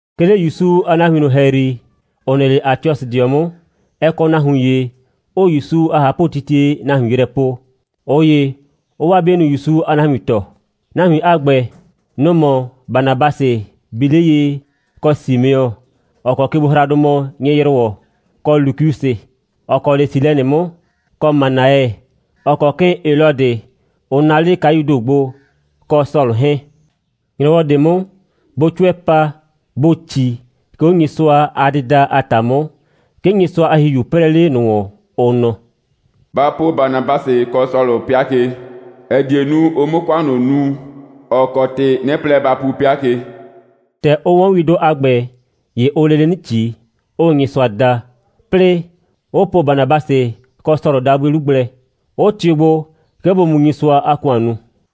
'Ke 'le ‑Yusu a nahuin ꞊nʋ ‑hɛyri, ‑ʋ nɩ 'le Atiɔsɩdɩɔ 'mʋ, ɛ kɔ nahuin ‑ye, 'ʋʋ ‑Yusu a ꞊hapʋtitie nahuin yrɛ po, ꞊ʋ ‑ye 'ʋʋ 'waa 'bienʋ ‑Yusu a nahuin tɔɔ. Nahuin a ‑gbɛ, nʋ‑ mɔ Banabasɩ bi 'le ye, kɔ Simeɔ, ‑ɔ kɔ kegbohraadʋ mɔ Nyɩ‑yrʋwɔ, kɔ Lukiusɩ, ‑ɔ kɔ 'le Silɛnɩ 'mʋ, kɔ Manaɛ, ‑ɔ kɔ 'kɩɩn Helɔdɩ, ʋ naa 'le kayuu ‑do gbo, kɔ Sɔlʋ 'hɛɛn. ‑Nyrɔwɔ ꞊de 'mʋ, bʋʋ 'cʋɛ pa, bʋʋ ꞊ci, 'ke 'o Nyɩsʋa a dɩda a ‑ta 'mʋ, 'ke Nyɩsʋa a ‑Hihiu 'prɛɛ 'le ꞊nʋ ‑wɔn, ʋ nɔ: «Ba po Banabasɩ kɔ Sɔlʋ 'pɩa ke, ‑ɛ die nu, ʋ 'mʋ ‑kʋan ꞊nʋ nu, ‑ɔ kɔ ‑tɩ 'nɩ plɛ ba pu 'pɩa ke.» ‑Tɛ ʋ 'wɔn windʋ a ‑gbɛ, ‑ye ʋʋ lele 'nɩ ꞊ci, 'ʋʋ Nyɩsʋa da, 'plɩɩ, 'ʋ po Banabasɩ kɔ Sɔlʋ dabʋɩ 'lu gblɛ, 'ʋ tɩʋ gbo, 'ke bʋ mu Nyɩsʋa a ‑kʋan nu.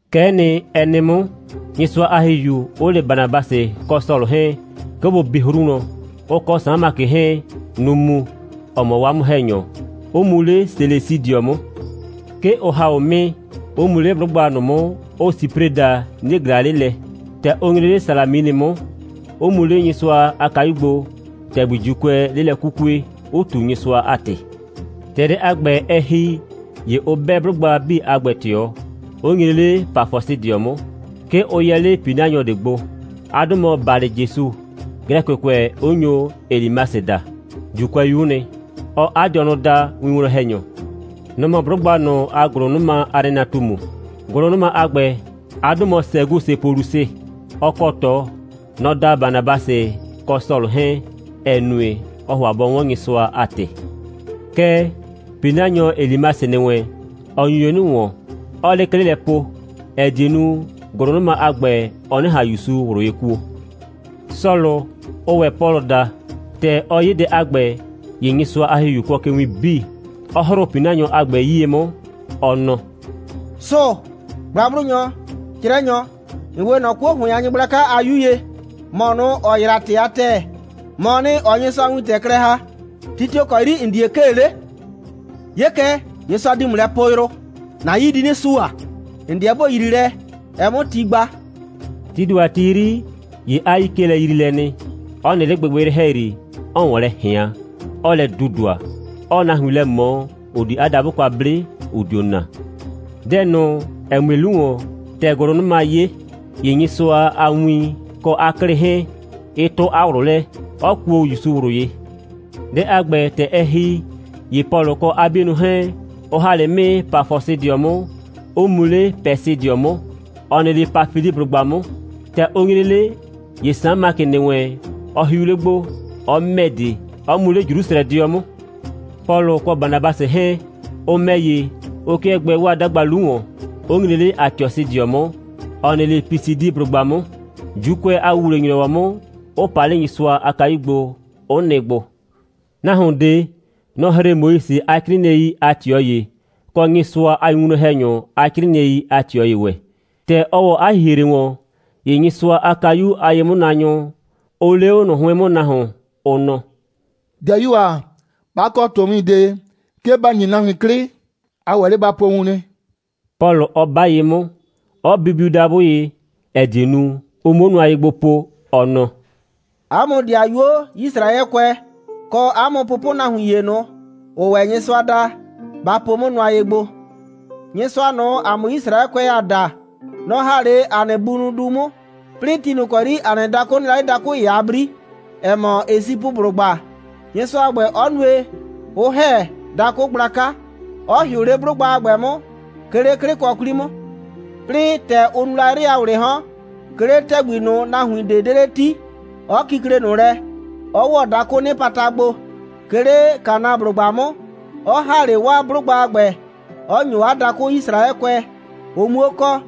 Kɛ'ɛ nɩ, ɛ nɩ 'mʋ, Nyɩsʋa a ‑Hihiu 'ʋ le Banabasɩ kɔ Sɔlʋ 'hɛɛn, 'ke bʋ bi 'hru wlɔn. Ʋ kɔ Saan Makɩ 'hɛɛn, nʋ‑ mu, ‑ɔ mɔ 'waa 'mʋ‑hɛnyɔ, 'ʋ mu 'le Selesidɩɔ 'mʋ. 'Ke ʋ ‑ha 'o 'mɩɩ, 'ʋ mu 'le 'blʋgba ꞊nʋ 'mʋ, ʋʋ Sipre daa, 'nie ꞊glaa 'le lɛ. ‑Tɛ ʋ nyre 'le Salaminɩ 'mʋ, ʋ mu 'le Nyɩsʋa a kayu gbo, ‑tɛgbi ‑Juukʋɛɛ 'le lɛ 'kukue, 'ʋ ꞊tu Nyɩsʋa a ‑tɩ. ‑Tɛ dɛ a ‑gbɛ, ɛ ‑hi, ‑ye ʋ 'bɛ 'blʋgba 'bii a ‑gbɛ ꞊tɩɔ, 'ʋ nyre 'le Pafɔsɩdɩɔ 'mʋ. 'Ke ʋ yɛ 'le ‑pinanyɔ ꞊de gbo. 'A 'dʋ mɔ Balɩjesu, Glɛkɩkʋɛ 'ʋ nyo Elimasɩ daa. ‑Juukʋɛyu'u nɩ. Ɔɔ 'a dɩɔnʋ daa winwlɔn‑hɛnyɔ. Nɔ‑ mɔ 'blʋgba ꞊nʋ a ‑gʋlʋnʋma a nɩnatumu. ‑Gʋlʋnʋma a ‑gbɛ, 'a 'dʋ mɔ Sɛgusɩ Polusɩ. Ɔ kɔ ꞊tɔ. Nɔ‑ da Banabasɩ kɔ Sɔlʋ 'hɛɛn, ‑ɛ nue, ɔɔ ‑hʋa bɔ 'wɔn Nyɩsʋa a ‑tɩ. Kɛɛ, ‑pinanyɔ Elimasɩ ‑nɩ wɛn, ɔ nyu ye 'nɩ ‑wɔn, 'ɔɔ 'le 'klɩ lɛ po, ‑ɛ die nu, ‑gʋlʋnʋma a ‑gbɛ, ɔ 'nɩ ꞊han ‑Yusu ꞊wlʋ ye kuo. Sɔlʋ, ʋʋ ‑wɛ Pɔlʋ daa, ‑tɛ ɔ 'ye dɛ a ‑gbɛ, ‑ye Nyɩsʋa a ‑Hihiu kʋɔ ke win 'bii, 'ɔ ‑hrʋʋ ‑pinanyɔ a ‑gbɛ 'yie 'mʋ, ɔ nɔ: «Sʋʋ‑, gblagblʋnyɔ, 'crɛnyɔ, ‑n 'we ꞊nɔ 'kuo ‑hʋɩn a nyɩgblaka a 'yu ye. ‑Mɔ ꞊nʋ, ‑ɔ yraa ‑tɩ a ‑tɛɛ, ‑mɔɔ nɩ, ‑ɔɔ Nyɩsʋa a win klɛ ‑ha. Ti tio‑ kɔ 'yri ‑n die 'kee 'le? 'Ye kɛ, Nyɩsʋa di ‑mʋ lɛ poo yrʋ. ‑Na 'yii di 'nɩ sua. ‑N 'deɛ ‑bo yrii lɛ, ɛ 'mʋ ti gba.» Tii ‑do a ti 'yri, ‑ye 'a 'yii 'kee lɛyriilɛ nɩ, 'ɔ nɩ 'le gbɩgbɩyrɩ ‑hɛyri, 'ɔɔ ‑wɔn lɛ ꞊hɩan, 'ɔɔ lɛ dudua, 'ɔɔ nahuin lɛ ꞊mɔ, ‑ʋ di 'a dabʋ kwa 'ble, ‑ʋ dio naa. Dɛ ꞊nʋ, ‑ɛ mue 'lu ‑wɔn, ‑tɛ ‑gʋlʋnʋma 'ye, ‑ye Nyɩsʋa a win kɔ 'a 'klɩ 'hɛɛn, ɩ 'tʋ 'a ꞊wlʋ lɛ, 'ɔ kuo ‑Yusu ꞊wlʋ ye. Dɛ a ‑gbɛ, ‑tɛ ɛ ‑hi, ‑ye Pɔlʋ kɔ 'a 'bienʋ 'hɛɛn, ʋ ‑ha 'le 'mɩɩ Pafɔsɩdɩɔ 'mʋ, 'ʋ mu 'le Pɛsɩdɩɔ 'mʋ, ‑ɔ nɩ 'le Pafiliblʋgba 'mʋ. ‑Tɛ ʋ nyre 'le, ‑ye Saan Makɩ ‑nɩ wɛn, ɔ hiu 'le gbo, 'ɔ ‑mɛ de, 'ɔ mu 'le Jrusrɛdɩɔ 'mʋ. Pɔlʋ kɔ Banabasɩ 'hɛɛn, ʋ ‑mɛ ‑ye, ʋ 'kɩɛ gbɛɛ 'waa 'dagba 'lu ‑wɔn, 'ʋ nyre 'le Atiɔsɩdɩɔ 'mʋ, ‑ɔ nɩ 'le Pisidiblʋgba 'mʋ. ‑Juukʋɛ a ‑wuwle‑nyrɔwɔ 'mʋ, 'ʋ pa 'le Nyɩsʋa a kayu gbo, 'ʋ nɩ gbo. Nahuon ꞊de, nɔ‑ ‑hre Moise a 'crɩɩnɩɛi a ꞊tɩɔ ‑ye, kɔ Nyɩsʋa a winwlɔn‑hɛnyʋ a 'crɩɩnɩɛi a ꞊tɩɔ ‑ye ‑wɛ. ‑Tɛ ɔ ‑wɔ 'a ‑hihre ‑wɔn, ‑ye Nyɩsʋa a kayu a ye'mʋnaanyʋ, ʋ lee 'o ꞊nʋ 'hʋɩn 'mʋ nahuon, ʋ nɔ: «‑Dɩayuo ‑a, 'ba kɔ ꞊tɔwin ꞊de, 'ke ba ‑nyi nahuin 'klɩ, a ‑wɛ 'le ba po wun nɩ,» Pɔlʋ 'ɔ 'ba ye 'mʋ, 'ɔ bibiu dabʋ ye, ‑ɛ die nu, ʋ 'muo nʋa ye gbo po, ɔ nɔ: «'A mʋ ‑dɩayuo Yisraɛkʋɛ, kɔ 'a mʋ pʋpʋnahuin ‑ye ꞊nʋ, ‑ʋʋ ‑wɛ Nyɩsʋa da, ba po 'mʋ nʋa ye gbo. Nyɩsʋa ꞊nʋ, ‑a mʋ Yisraɛkʋɛ, ‑aa da, nɔ‑ ‑ha 'le ‑a nɩ bunʋ du 'mʋ, 'plɩɩ ti ꞊nʋ ‑kɔ 'yri ‑a nɩ dakʋ nɩ la 'le dakʋ ‑ye a 'bri, ‑ɛ mɔ Esipʋblʋgba, Nyɩsʋa a ‑gbɛ 'ɔ nue, 'ʋ ‑hɛ dakʋ gblaka, 'ɔ ‑hɩʋ 'le 'blʋgba a ‑gbɛ 'mʋ, 'ke 'le 'klɩkɔ 'kwli 'mʋ. 'Plɩɩ, ‑tɛ ʋ nu la 'yrɩ a ‑wlɩɩ 'hɔn, 'ke 'le ‑tɛgbi ꞊nʋ, nahuin ꞊de 'de 'le 'ti, 'ɔ kikle ꞊nʋ lɛ, 'ɔ ‑wɔ dakʋʋ 'nɩpata gbo, 'ke 'le Kanaablʋgba 'mʋ, 'ɔ ‑ha 'le 'waa 'blʋgba a ‑gbɛ, 'ɔ ‑nyo 'a dakʋ Yisraɛkʋɛ, ʋ 'muo kɔ.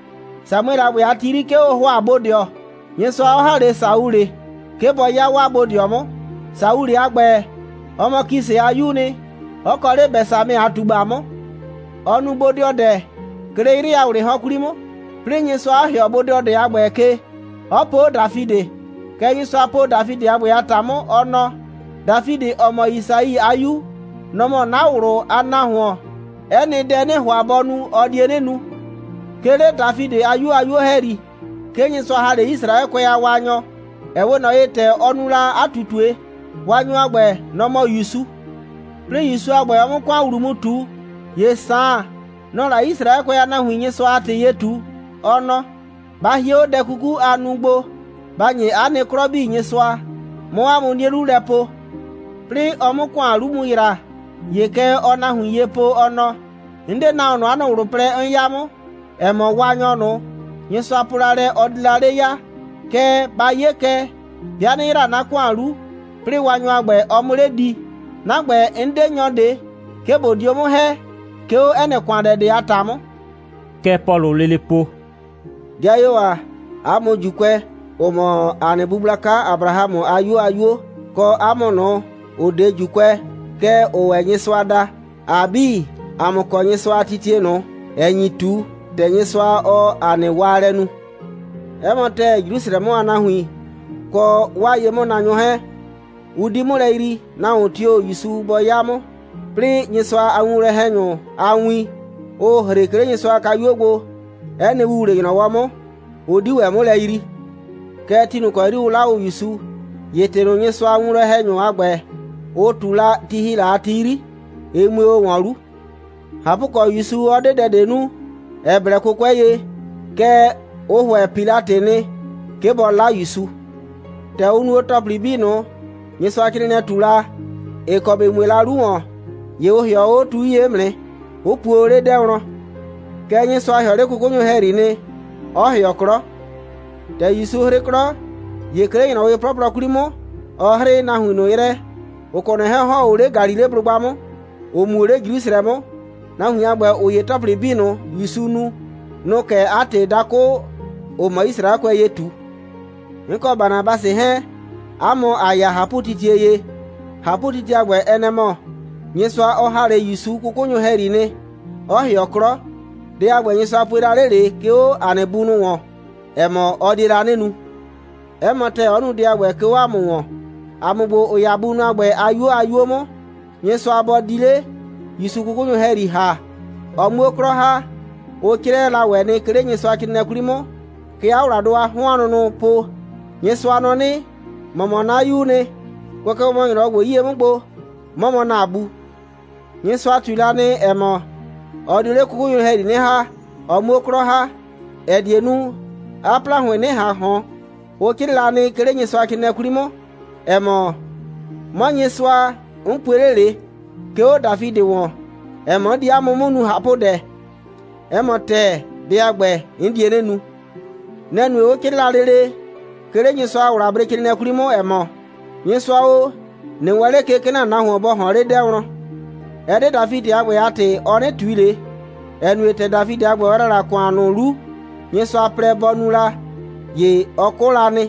Samuɛlɩ a ‑gbɛ a ti 'yri, 'ke ʋ ‑hʋa bodɩɔ, Nyɩsʋa 'ɔ ‑ha 'le Saulɩ, 'ke bɔ 'ya 'waa bodɩɔ 'mʋ. Saulɩ a ‑gbɛ, ɔ mɔ Kisɩ a 'yuu nɩ, 'ɔ kɔ 'le Bɛsamɛ a ꞊tugba 'mʋ. Ɔ nu bodɩɔdɛ, 'ke 'le 'yrɩɩ a ‑wlɩɩ 'hɔn 'kwli 'mʋ, 'plɩɩ Nyɩsʋa 'ɔ ‑hɩɔ bodɩɔdɛ a ‑gbɛ ke, 'ɔ po 'o Dafidɩ. Kɛ Nyɩsʋa po Dafidɩ a ‑gbɛ a ‑ta 'mʋ, ɔ nɔ: Dafidɩ, ‑ɔ mɔ Yisai a 'yu, nɔ‑ mɔ 'na ꞊wlʋ a nahuon. 'Ɛ nɩ dɛ, 'nɩɩ ‑hʋa bɔ nu, ɔ die 'nɩ nu. 'Ke 'le Dafidɩ a 'yuo a 'yuo ‑hɛyri, 'ke Nyɩsʋa ‑ha 'le Yisraɛkʋɛ a Waanyɔ, ‑ɛ 'we ꞊nɔ ye, ‑tɛ ɔ nu la 'a ꞊tutue. Waanyɔ a ‑gbɛ, nɔ‑ mɔ ‑Yusu. 'Plɩɩ ‑Yusu a ‑gbɛ, ɔ 'mʋ ‑kʋan ‑wlu mu ꞊tu, ‑ye Saan, nɔ‑ɔ la Yisraɛkʋɛ a nahuin Nyɩsʋa a ‑tɩ ye ꞊tu, ɔ nɔ: Ba hie 'o dɛ kuku, aa nu gbo, ba ‑nye 'a nɩ 'klɔ 'bii Nyɩsʋa, 'mʋ 'a mʋ 'nie 'lu lɛ po. 'Plɩɩ ɔ 'mʋ 'a ‑kʋan 'lu mu ‑yra, ‑ye kɛ ɔɔ nahuin ye po, ɔ nɔ: 'N 'de nahuon ꞊nʋ, 'a nɩ ꞊wlʋ plɛ 'n 'ya 'mʋ, ‑ɛ mɔ Waanyɔ ꞊nʋ, Nyɩsʋa po la lɛ, ɔ di la 'le ya. Kɛɛ, ba 'ye kɛ, 'bɩa 'nɩ ‑yra 'na ‑kʋan 'lu, 'plɩɩ Waanyɔ a ‑gbɛ, ɔ 'mʋ 'le di. 'Na ‑gbɛ, 'n 'de nyɔ ꞊de, 'ke ꞊bo dio 'mʋ ‑hɛ, 'ke 'o 'ɛ nɩ ‑kʋandɛ ꞊de a ‑ta 'mʋ.» Kɛ Pɔlʋʋ lele po: «'Dɩayuo ‑a, 'a mʋ ‑Juukʋɛ, ‑ʋ mɔ ‑a nɩ bu gblaka Abrahamʋ a 'yuo a 'yuo, kɔ 'a mʋ ꞊nʋ, ‑ʋ 'de ‑Juukʋɛ, kɛɛ ‑ʋʋ ‑wɛ Nyɩsʋa da, ‑a 'bii, ‑a mʋ kɔ Nyɩsʋa a titie ꞊nʋ, ‑ɛ nyi ꞊tu, ‑tɛ Nyɩsʋa, ɔɔ ‑a nɩ waalɛ nu. 'Ɛ mɔ ‑tɛɛ, Jrusrɛ 'mʋ a nahuin kɔ 'waa ye'mʋnaanyʋ 'hɛɛn, ʋ 'di 'mʋ lɛ yrii, nahuon tio‑ ‑Yusu bɔ 'ya 'mʋ, 'plɩɩ, Nyɩsʋa a winwlɔn‑hɛnyʋ a win, ʋʋ ‑hre, 'ke 'le Nyɩsʋa a kayuo gbo, 'ɛ nɩ ‑wuwle‑nyrɔwɔ 'mʋ, ʋ 'di ‑wɛ 'mʋ lɛ yrii. Kɛɛ, ti ꞊nʋ ‑kɔ 'yri ʋ 'la o ‑Yusu, ‑ye ‑tɩ ꞊nʋ, Nyɩsʋa a winwlɔn‑hɛnyʋ a ‑gbɛ, ʋ ꞊tu la, ti ‑hi la a ti 'yri, ɩ mue o ‑wɔn 'lu. ꞊Hapʋkɔ, ‑Yusu 'ɔ 'de dɛ ꞊de nu, ‑ɛ blɛ 'kʋkʋɛ ye, kɛɛ, ʋ ‑hʋɛ Pilatɩ nɩ, 'ke bɔ 'la ‑Yusu. ‑Tɛ ʋ nu o ‑tɔplɩ 'bii ꞊nʋ, Nyɩsʋacrɩɩnɩɛ ꞊tu la, ‑ɩ kɔ ‑bɩ mue la 'lu ‑wɔn, ‑ye ʋ ‑hɩɔ o 'o tu 'yie 'mʋ nɩ, 'ʋ puo o 'le 'dɛɛ wlɔn. Kɛɛ, Nyɩsʋa ‑hɩɔ 'le 'kʋkʋnyʋ ‑hɛyri nɩ, 'ɔ ‑hɩɔ 'klɔ. ‑Tɛ ‑Yusu 'hrɩ 'klɔ, ‑ye 'ke 'le ‑nyrɔwɩ 'plɔplɔ 'kwli 'mʋ, ɔ 'hrɩɩ nahuin ꞊nʋ yrɛ, ‑ʋ kɔ ꞊nɔ 'hɛɛn, ‑ʋ ‑hɔn o 'le Galileblʋgba 'mʋ, ‑ʋ mu o 'le Jrusrɛ 'mʋ. Nahuin a ‑gbɛ, ‑ʋ 'ye ‑tɔplɩ 'bii ꞊nʋ, ‑Yusu nu, nʋ‑ʋ kɛ 'a ‑tɩ dakʋ, ‑ʋ mɔ Yisraɛkʋɛ ye ꞊tu. 'N kɔ Banabasɩ 'hɛɛn, 'a mʋ ‑a ya ꞊hapʋtitie ye. ꞊Hapʋtitie a ‑gbɛ, ɛ nɛ‑ mɔ: Nyɩsʋa, ɔ ‑ha 'le ‑Yusu 'kʋkʋnyʋ ‑hɛyri nɩ, 'ɔ ‑hɩɔ 'klɔ. Dɛ a ‑gbɛ, Nyɩsʋa pue la 'le ꞊le, 'ke 'o ‑a nɩ bunʋ ‑wɔn, ‑ɛ mɔ, ɔ die la 'nɩ nu. 'Ɛ mɔ ‑tɛɛ, 'ɔ nu dɛ a ‑gbɛ, 'ke 'o ‑a mʋ ‑wɔn, ‑a mʋ ‑gbo, ‑ʋ 'ya bunʋ a ‑gbɛ a 'yuo a 'yuo 'mʋ. Nyɩsʋa bɔ di 'le ‑Yusu 'kʋkʋnyʋ ‑hɛyri ‑ha, ɔ 'muo 'klɔ ‑ha, ʋ 'crɩɛ la ‑wɛ nɩ, 'ke 'le Nyɩsʋa a ‑wlabrecrɩɩnɩɛ 'kwli 'mʋ. Kɛ 'a ‑wladʋ a 'hɔn a nʋnʋʋ po: Nyɩsʋa nɔ 'nɩ: ‑Mɔ mɔ 'na 'Yuu nɩ. Kʋɛ kɛ mɔ ‑nyrɔwɔ ‑gbo 'yie 'mʋ gbo, 'mɔ mɔ ‑na Bu. Nyɩsʋa ꞊tui la nɩ, ‑ɛ mɔ, ɔ dio 'le 'kʋkʋnyʋ ‑hɛyri 'nɩ ‑ha, ɔ 'muo 'klɔ ‑ha, ‑ɛ die nu, 'a ‑plahʋɩn 'nɩ ꞊han ꞊hɔn, 'ʋ 'crɩɩ la, 'ke 'le Nyɩsʋacrɩɩnɩɛ 'kwli 'mʋ, ‑ɛ mɔ: 'Mɔ Nyɩsʋa, 'n pue 'le ꞊le, 'ke 'o Dafidɩ ‑wɔn, ‑ɛ mɔ, 'n di 'a mʋ 'mʋ nu ꞊hapʋdɛ. 'Ɛ mɔ ‑tɛɛ, dɛ a ‑gbɛ, 'n die 'nɩ nu. Nɛ‑ nue, 'ʋ 'crɩɩ la lele, 'ke 'le Nyɩsʋa a ‑wlabrecrɩɩnɩɛ 'kwli 'mʋ, ‑ɛ mɔ: Nyɩsʋa o, ꞊nɩ wɛɛn ꞊le ke, 'ke ‑na nahuon bɔ ꞊hɔɔn 'le 'dɛɛ wlɔn. Ɛ 'de Dafidɩ a ‑gbɛ a ‑tɩ, ɔ 'nɩ ꞊tui ꞊le, ‑ɛ nue, ‑tɛ Dafidɩ a ‑gbɛ, ɔ ‑yra la ‑kʋan ꞊nʋ 'lu, Nyɩsʋa plɛ bɔ nu la, ‑ye ɔ 'kʋ la nɩ,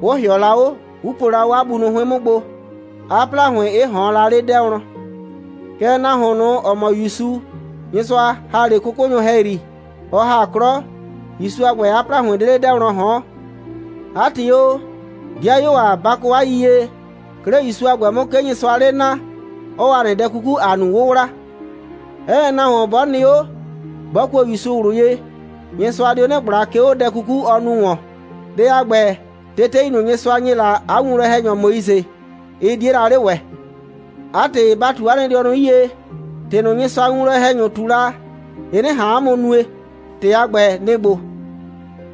'ʋ ‑hɩɔ la 'o, 'ʋ puo la 'o 'a bunʋ 'hʋɩn 'mʋ gbo, 'a ‑plahʋɩn 'ɩ ꞊hɔɔn la 'le 'dɛɛ wlɔn. Kɛɛ, nahuon ꞊nʋ, ‑ɔ mɔ ‑Yusu, Nyɩsʋa ‑ha 'le 'kʋkʋnyʋ ‑hɛyri, ɔ ‑ha 'klɔ, ‑Yusu a ‑gbɛ, 'a ‑plahʋɩn 'de 'le 'dɛɛ wlɔn ꞊hɔɔn. 'A ‑tɩ o, 'dɩayuo ‑a, ba kɔ 'a yiyie: 'ke 'le ‑Yusu a ‑gbɛ 'mʋ, 'ke Nyɩsʋaa 'le naa, 'ɔɔ ‑a nɩ dɛ 'kuku, ‑a nu 'wʋwla. 'Ɛ nɩ nahuon 'bɔ nɩ 'o, 'bɔ kuo ‑Yusu ꞊wlʋ ye, Nyɩsʋa dio 'nɩ ꞊gbla, 'ke 'o dɛ 'kuku, ɔ nu ‑wɔn. Dɛ a ‑gbɛ, tetei ꞊nʋ, Nyɩsʋa ‑nye la 'a winwlɔn‑hɛnyɔ Moise, ɩ 'die la 'le ‑wɛ. 'A ‑tɩ, ba ꞊tu 'a nɩ dɩɔnʋ 'yie, ‑tɩ ꞊nʋ, Nyɩsʋa a winwlɔn‑hɛnyʋ ꞊tu la, ɩ 'nɩ ꞊han 'a mʋ nue. ‑Tɩ a ‑gbɛ, nɩ‑ ‑gbo: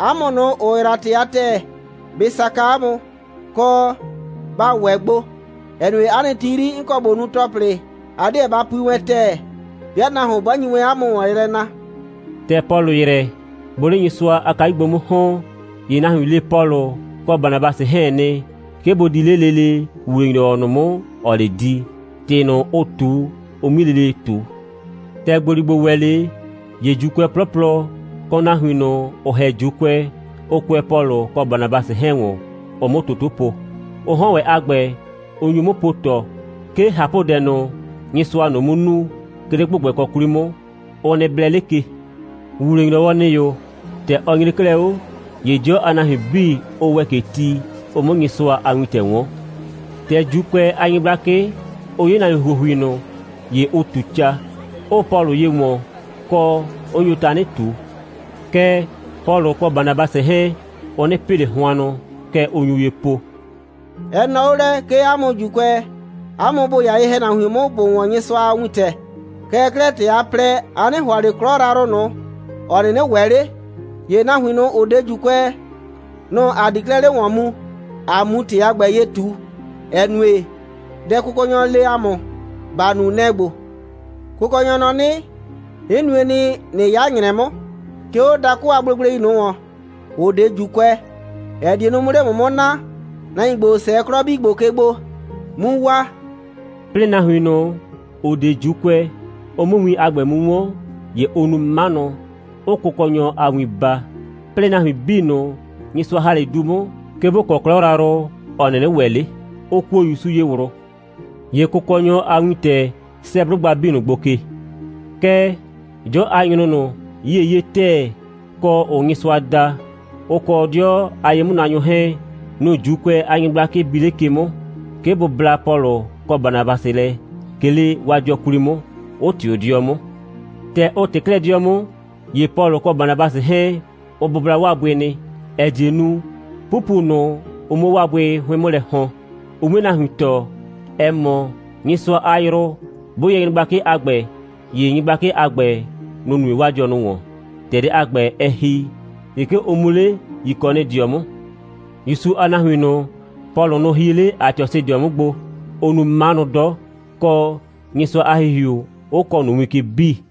'A mʋ ꞊nʋ, ‑ʋ yraa ‑tɩ a ‑tɛɛ, bɩ saka 'a mʋ, kɔ, ba ‑wɛ gbo, ‑ɛ nue, 'a nɩ ti 'yri, 'n kɔ ꞊bo nu ‑tɔplɩ, a 'deɛ ba pui wɛn ‑tɛɛ, 'bɩa nahuon 'bɔ nyi wɛn 'a mʋ ‑wɔn yrɛ na.» ‑Tɛ Pɔlʋ ‑yrɛ, bʋʋ 'le Nyɩsʋa a kayu gbo 'mʋ ‑hɔn, ‑ye nahuin le Pɔlʋ kɔ Banabasɩ 'hɛɛn nɩ, 'ke bʋ di 'le lele ‑wuwle‑nyrɔwɔ ꞊nʋ 'mʋ, ‑ɔɔ 'le di, ‑tɩ ꞊nʋ, ʋ ꞊tu, ʋ 'mui lele ꞊tu. ‑Tɛ ‑gboligbo ‑wɛ 'le, ‑ye ‑Juukʋɛ 'plɔplɔ, kɔ nahuin ꞊nʋ, ‑ʋ ‑hɛ ‑Juukʋɛ, ʋ kʋɛ Pɔlʋ kɔ Banabasɩ 'hɛɛn ‑wɔn, ʋ 'mʋ toto po. Ʋ 'hɔn ‑wɛ a ‑gbɛ, ʋ nyu 'mʋ po ꞊tɔ, 'ke ꞊hapʋdɛ ꞊nʋ, Nyɩsʋaa ꞊nʋ 'mʋ nu, 'ke 'le ‑gbʋgbɛkɔ 'kwli 'mʋ, ʋ nɩ blɛ 'le ke. ‑Wuwle‑nyrɔwɔ ‑nɩ o, ‑tɛ ɔ nyre 'klɛɛ 'o, ‑ye 'dɩɔ a nahuin 'bii, ʋ ‑wɛ ke ti, ʋ 'mʋ Nyɩsʋa a wintɛ 'wɔn. ‑Tɛ ‑Juukʋɛ a nyɩgblakɩ, ʋ 'ye nahuin ‑huohui ꞊nʋ, ‑ye ʋ ꞊tu ca, 'ʋʋ Pɔlʋ ye ‑wɔn, kɔ, 'ʋ nyo tanɩ ꞊tu. Kɛɛ, Pɔlʋ kɔ Banabasɩ 'hɛɛn, ʋ 'nɩ pɩ ꞊le hʋannʋ, kɛ ʋ nyu ye po: «Ɛ nɔɔ 'o lɛ, 'ke 'a mʋ ‑Juukʋɛ, 'a mʋ ‑bʋ 'ya ye‑hɛnahuin 'mʋ, ‑bʋ 'wɔn Nyɩsʋa a wintɛ. Kɛɛ 'klɛɛ, ‑tɛ a plɛ, a 'nɩ ‑hʋa ꞊le 'klɔ yrayrʋ ꞊nʋ, ‑ɔ 'nɩnɩ ‑wɛ 'le, ‑ye nahuin ꞊nʋ, ‑ʋ 'de ‑Juukʋɛ, nʋ‑ ‑a di 'klɛɛ 'le ‑wɔn mu, ‑a 'mu ‑tɩ a ‑gbɛ ye ꞊tu, ‑ɛ nue, dɛ Kʋkɔnyɔ le ‑a mʋ, ‑ba nu, nɛ‑ ‑gbo: Kʋkɔnyɔ nɔ 'nɩ: 'N nue nɩ, ꞊nɩ 'ya ‑nyrɛ 'mʋ, 'ke 'o dakʋ a gblegblei ꞊nʋ ‑wɔn, ‑ʋ 'de ‑wɛ ‑Juukʋɛ, ‑ɛ die nu, 'mʋ 'le ‑mʋ 'mʋ naa, nahuin ‑gbo, ‑ʋ 'sɛɛ 'klɔ 'bii ‑gbo ke gbo, 'mu waa.» 'Plɩɩ nahuin ꞊nʋ, ‑ʋ 'de ‑Juukʋɛ, ʋ 'mʋ win a ‑gbɛ mu 'wɔn, ‑ye ʋ nu 'manʋ, 'ʋʋ Kʋkɔnyɔ a win baa. 'Plɩɩ, nahuin 'bii ꞊nʋ, Nyɩsʋa ‑ha 'le du 'mʋ, 'ke ‑bʋ kɔ 'klɔ yrayrʋ, ‑ɔ 'nɩnɩ ‑wɛ 'le, ʋ kuo ‑Yusu ye ꞊wlʋ. ‑Ye Kʋkɔnyɔ a wintɛ 'sɛɛ 'blʋgba 'bii ꞊nʋ gbo ke. Kɛɛ, 'dɩɔ a nyrʋ ꞊nʋ, 'yiee 'ye ‑tɛɛ, kɔ, ‑ʋʋ Nyɩsʋa da, ʋ kɔ 'dɩɔ a ye'mʋnaanyʋ 'hɛɛn, nʋ‑ ‑Juukʋɛ a nyɩgblakɩ bi 'le ke 'mʋ, 'ke bʋ bla Pɔlʋ kɔ Banabasɩ lɛ, 'ke 'le 'waa 'dɩɔ 'kwli 'mʋ, 'ʋ ꞊tɩʋ 'dɩɔ 'mʋ. ‑Tɛ ʋ ꞊tɩ 'klɛɛ 'dɩɔ 'mʋ, ‑ye Pɔlʋ kɔ Banabasɩ 'hɛɛn, ʋ bʋbla 'waa bʋɩ, ‑ɛ die nu, 'pupu ꞊nʋ, ʋ 'mʋ 'o 'waa bʋɩ 'hʋɩn 'mʋ lɛ ‑hɔn, ʋ 'mue nahuin tɔɔ, ‑ɛ mɔ, Nyɩsʋa a yrʋ 'bʋ yɛ nyɩgblakɩ a ‑gbɛ, ‑ye nyɩgblakɩ a ‑gbɛ, nʋ‑ nue 'waa dɩɔnʋ ‑wɔn. ‑Tɛ dɛ a ‑gbɛ, ɛ ‑hi, ‑ye 'ke ʋ mu 'le Yikɔnɩdɩɔ 'mʋ. ‑Yusu a nahuin ꞊nʋ, Pɔlʋ nʋ hie 'le Atiɔsɩdɩɔ 'mʋ gbo, ʋʋ nu 'manʋ 'dɔ, kɔ, Nyɩsʋa a ‑Hihiu 'ʋ kɔɔ ꞊nʋ win ke 'bii.